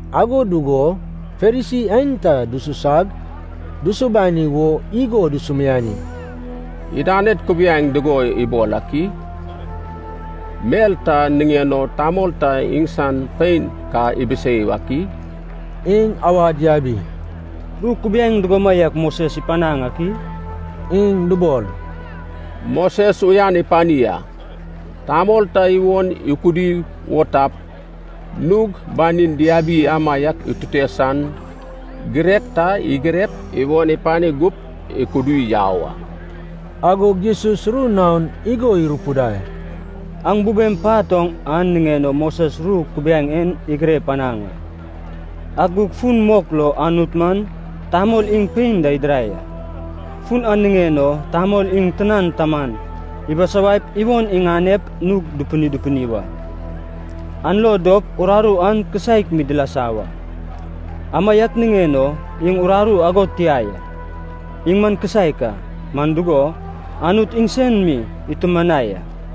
Ago dugo Farisi aenta dususag dusubani wo igo dusumiani, “Idaned kubiaeŋ dugo ibol ak i? Mel ta niŋen o tamol ta iŋsan pein ka ibisei ak i?” Iŋ awad yabi, “Ru kubiaeŋ dugomaiak Moses ipanaŋ ak i?” Iŋ dubol, “Moses uyan ipani a, tamol ta iwon ikudi wo tap, nug banin diabi amaiak itute san girek ta igirep, iwon ipani gup ikudi yau a.” Agog Jesus ru naon igo irupidai, “Aŋ bubem pat oŋ an niŋen o Moses ru kubiaeŋ en igire panaŋ a. Ak gug fun mok lo Anut man ‘tamol iŋ pein da idirai a. Fun an niŋen o tamol iŋ tinan taman ibisawaip iwon iŋanep nug dupini dupini wa, an lo dop uraru an kisaek mi dilasa wa.’ Amaiak niŋen o iŋ uraru ago tia ya, iŋ man kisaek a, man dugo Anut iŋsen mi itumanai a.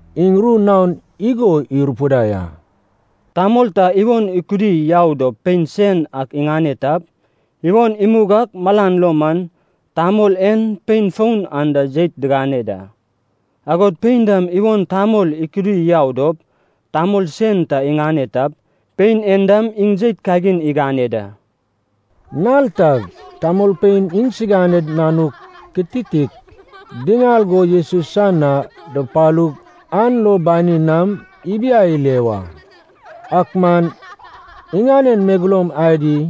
Iŋ ru naon igo irupidai a, “Tamol ta iwon ikudi yau dop pein sen ak iŋane tap, iwon imug ak malan lo man tamol en pein foun an da jeit digane da. Agod pein dam iwon tamol ikudi yau dop tamol sen ta iŋane tap, pein en dam iŋ jeit kagin igane da.” Nal tag tamolpein iŋsiganed nanuk kititik diŋal go Jesus san na dupalug an lo banin nam ibiai ile wa. Ak man iŋanen megeloum adi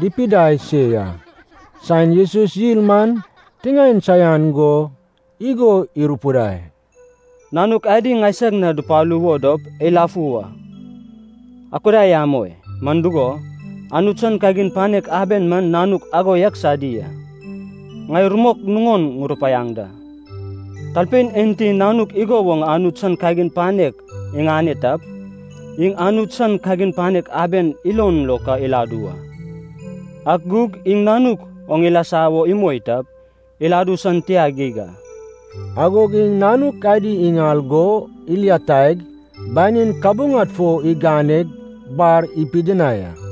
dipidai se ya. Saen Jesus yil man tiŋaen saian go igo irupidai, “Nanuk adi ŋaisag na dupalu wo dop eilafu wa, akudai amoi. Man dugo, Anut san kagin panek aben man nanuk ago yak sadi a. Ŋai rumok nuŋon ŋurupaiaŋ da. Talpein enti nanuk igo woŋ Anut san kagin panek iŋane tap, iŋ Anut san kagin panek aben ilon lo ka iladu wa. Ak gug iŋ nanuk oŋ ilasa wo imoi tap, iladu san tia geig a.” Agog iŋ nanuk adi iŋal go ilataig, banin kabuŋad fo iganeg bar ipidinai a.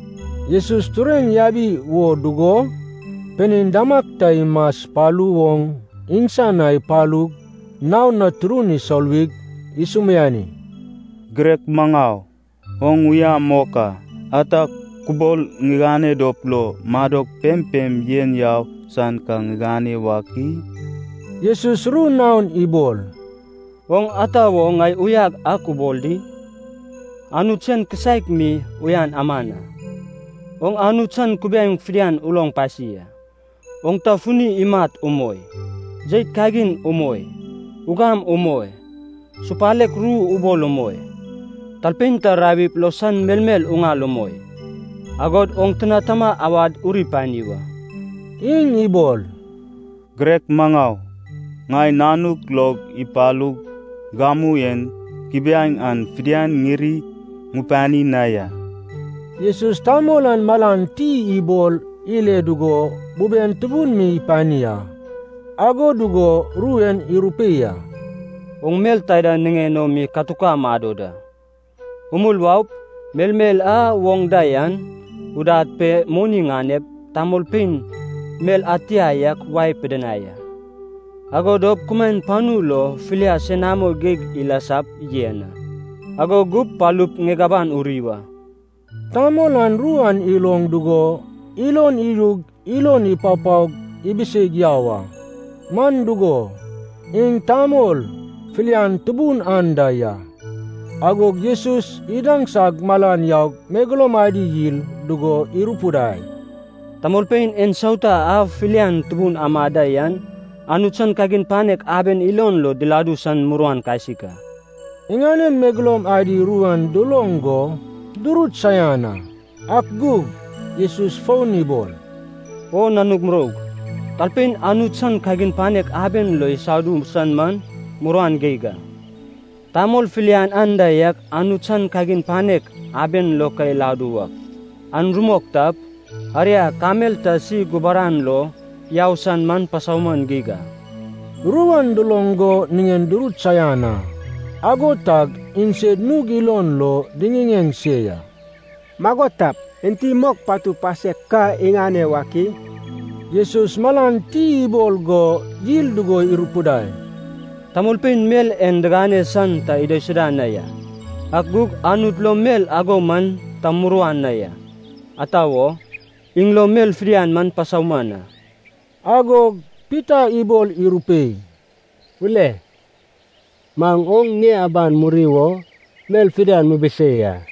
Jesus tureŋ yabi wo dugo, pinein damag ta imaspalu oŋ iŋsan na ipalug naon na turun isoluwig isumiani, “Girek maŋau oŋ uya mok a, ata kubol ŋigane dop lo madok pempem yen yau san ka ŋiŋane wak i?” Jesus ru naon ibol, “Oŋ ata wo ŋai uyag ak ubol di? Anut sen kisaek mi uyan aman a. Oŋ Anut san kubiaeŋ fidian uloŋ pasi a: oŋ ta funi imat umoi, jeit kagin umoi, ugam umoi, supalek ru ubol umoi, talpein ta rawip lo san melmel uŋal umoi, agod oŋ tina tama awad uri pani wa.” Iŋ ibol, “Girek maŋau, ŋai nanuk log ipalug gamu en kubiaeŋ an fidian ŋiri ŋupani na ya.” Jesus tamol an malan ti ibol ile dugo buben tubun mi ipani a. Ago dugo ru en irupei a, “Oŋ mel taida niŋen o mi katuka mado da. Umul waup, melmel a oŋ da yan udad pe moni ŋanep, tamolpein mel ad tia ak wae pidinai a. Ago dop kumaen panu lo filia senamo geig ilasap yen a. Ago gup palup ŋieg aban uri wa.” Tamol an ru an iloŋ dugo ilon idug ilon ipapaog ibiseig yau a. Man dugo, iŋ tamol filian tubun anda ya. Agog Jesus idaŋsag malan yaug megeloum adi yil dugo irupidai, “Tamolpein ensauta a filian tubun amad da yan, Anut san kagin panek aben ilon lo diladu san muruan kasik a!” Iŋanen megeloum adi ru an duloŋ go durut saian a. Ak gug Jesus fon ibol, “O nanug muroug, talpein Anut san kagin panek aben lo isadu san man muruan geig a! Tamol filian anda yak Anut san kagin panek aben lo ka iladu wak, an rumok tap, aria kamel ta si gubaran lo yau san man pasauman geig a.” Ru an duloŋ go nen durut saian a. Ago tag iŋsed nug ilon lo diŋiŋeŋ se ya, “Mago tap, enti mok patu pasek ka iŋane wak i?” Jesus malan ti ibol go yil dugo irupidai, “Tamolpein mel en digane san ta idaisuda na ya, ak gug Anut lo mel ago man ta muruan na ya, ata wo, iŋ lo mel fidian man pasauman a.” Agog Pita ibol irupei, “Ule maŋ oŋ ŋie aban muri wo mel fidian mibisei a!”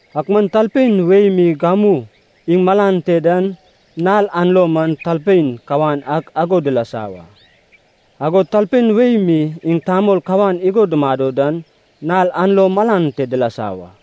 Ak man talpein wei mi gamu iŋ malan te dan nal an lo man talpein kawan ak ago dilasa wa. Agod talpein wei mi iŋ tamol kawan igo dumado dan nal an lo malan te dilasa wa.”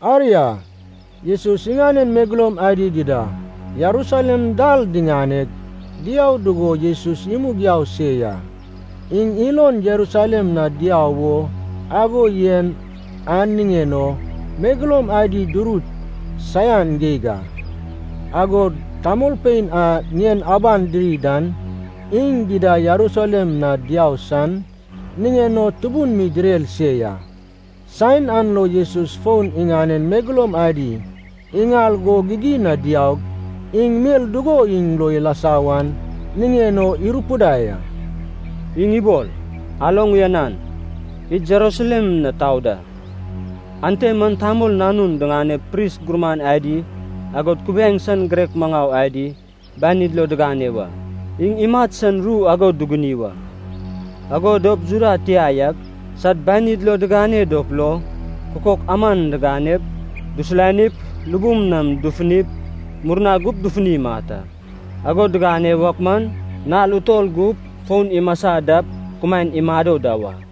Aria, Jesus iŋanen megeloum adi dida Jerusalem dal diŋaneg, diau dugo Jesus imug yau se ya. Iŋ ilon Jerusalem na diau wo ago yen an niŋen o megeloum adi durut saian geig a, agod tamolpein a ŋien aban diri dan iŋ dida Jerusalem na diau san niŋen o tubun mi direr se ya. Saen an lo Jesus fon iŋanen megeloum adi iŋal go gigin na diaug iŋ mel dugo iŋ lo ilasa wan niŋen o irupidai a. Iŋ ibol, “Aloŋ uyanan, id Jerusalem na tau da. Ante man Tamol Nanun diŋanep pris gurman adi agod kubiaeŋ san girek maŋau adi banid lo digane wa. Iŋ imat san ru ago duguni wa. Ago dop Juda tia yak sad banid lo digane dop lo kukok aman diganep, dusulanip, lubum nam dufunip murna gup dufuni imat a. Ago digane wak man nal utol gup fon imasa dap kumaen imado da wa.”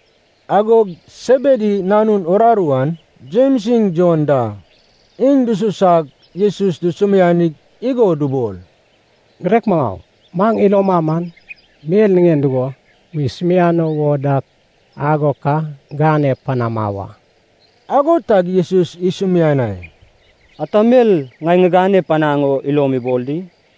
Agog Sebedi nanun uraru an, Jems iŋ Jon da, iŋ dususag Jesus dusumianig igo dubol, “Girek maŋau, maŋ iloma man, mel niŋen dugo musumiano wo dak ago ka gane panama wa.” Ago tag Jesus isumianai, “Ata mel ŋai ŋigane panaŋ o ilom ibol di?”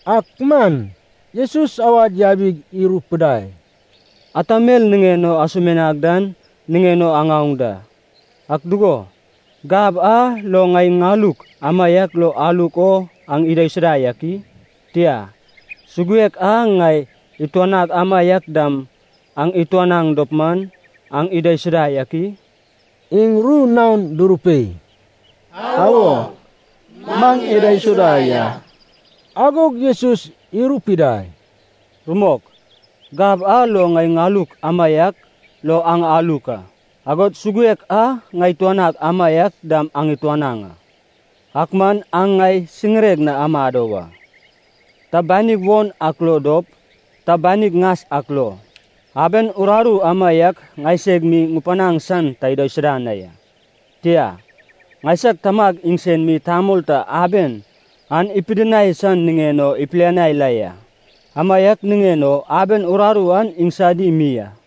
Ak man Jesus awad yabig irupidai, “Ata mel niŋen o asumianag dan niŋen o aŋaoŋ da. Ak dugo, gab a lo ŋai ŋaluk amaiak lo aluk o aŋ idaisuda yak i? Tia, suguek a ŋai ituanag amaiak dam aŋ ituanaŋ dop man, aŋ idaisuda yak i?” Iŋ ru naon durupei, “Awo, maŋ idaisuda ya.” Agog Jesus irupidai, “Rumok, gab a lo ŋai ŋaluk amaiak lo aŋ aluk a, agod suguek a ŋai ituanag amaiak dam aŋ ituanaŋ a. Ak man aŋ ŋai siŋireg na amado wa, ta banig won ak lo dop, ta banig ŋas ak lo, aben uraru amaiak ŋaiseg mi ŋupanaŋ san ta idaisuda na ya. Tia, ŋaisag Tamag iŋsen mi tamol ta aben an ipidinai san niŋen o ipilianai la ya, amaiak niŋen o aben uraru an iŋsadi mi a.”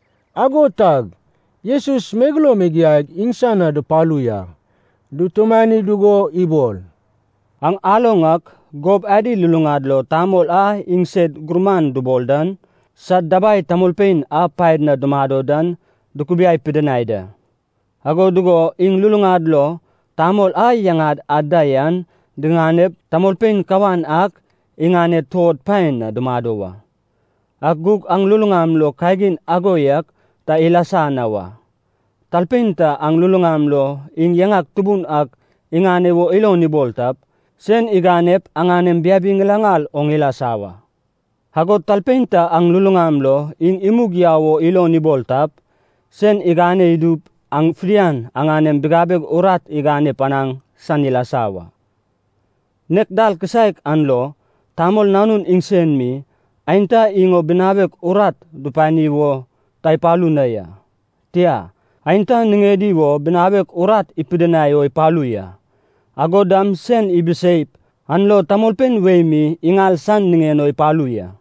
Ago tag Jesus megeloum igiaig iŋsan na dupalu ya. Dutumani dugo ibol, “Aŋ aloŋ ak gob adi luluŋad lo tamol a iŋsed gurman dubol dan, sad dabai tamolpein a paed na dumado dan dukubiai pidinai da. Ago dugo iŋ luluŋad lo tamol a yaŋad ad da yan diganep tamolpein kawan ak iŋaned tuod paen na dumado wa. Ak gug aŋ luluŋam lo kagin ago yak ta ilasa na wa. Talpein ta aŋ luluŋam lo iŋ yaŋan tubun ak iŋane wo ilon ibol tap, sen iganep aŋanem biabi ŋilaŋal oŋ ilasa wa. Agod talpein ta aŋ luluŋam lo iŋ imug yau wo ilon ibol tap, sen igane idup aŋ fidian aŋanem bigabeg urat igane panaŋ san ilasa wa. Nek dal kisaek an lo Tamol Nanun iŋsen mi, aenta iŋ o binawek urat dupani wo ta ipalu na ya, tia, aenta niŋedi wo binawek urat ipidinai o ipalu ya, agod dam sen ibiseip an lo tamolpein wei mi iŋal san niŋen o ipalu ya.”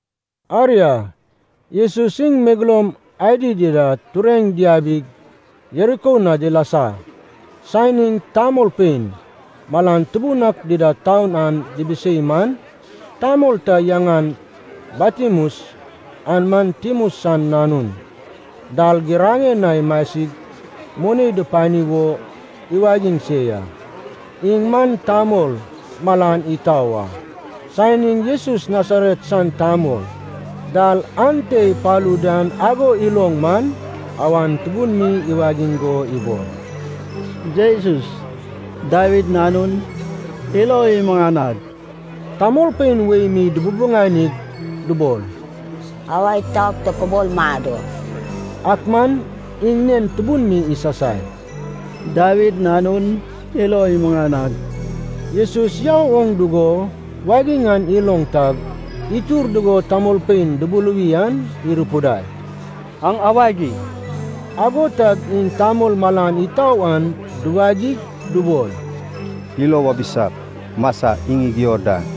Aria, Jesus iŋ megeloum adi dida tureŋ diabig Jeriko na dilasa. Saen iŋ tamolpein malan tubun ak dida taun an dibisei man, tamol ta yaŋan Bartimeus (an man Timeus san nanun) dal giraŋen na imasig moni dupani wo iwagiŋ se ya. Iŋ man tamol malan itau a. Saen iŋ Jesus Nasaret san tamol dal ante ipalu dan ago iloŋ man, awan tubun mi iwagiŋ go ibol, “Jesus, Dawid Nanun, ilo imuŋanag!” Tamolpein wei mi dububuŋanig, dubol, “Awa itaup tokubol mado!” Ak man iŋ nen tubun mi isasai, “Dawid Nanun, ilo imuŋanag!” Jesus yau oŋ dugo wagiŋ an iloŋ tag, itur dugo tamolpein dubuluwi an irupidai, “Aŋ awagi.” Ago tag iŋ tamol malan itau an duwagig dubol, “Ilo wabisap, masa, iŋ igio da.”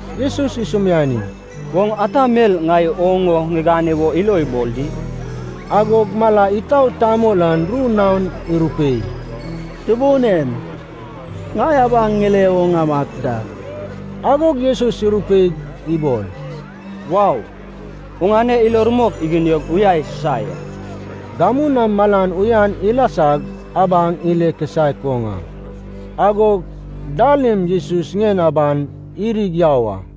Jesus isumiani, “Oŋ ata mel ŋai oŋ o ŋigane wo ilo ibol di?” Agog mala itau tamol an ru naon irupei, “Tubun en, ŋai abaŋ ŋile wo ŋamat da.” Agog Jesus irupeig ibol, “Wau. Oŋane ilo rumok iginiog uya isusa ya.” Gamu nam malan uyan ilasag abaŋ ile kisaek oŋ a. Agog dal im Jesus ŋien aban irig yau a.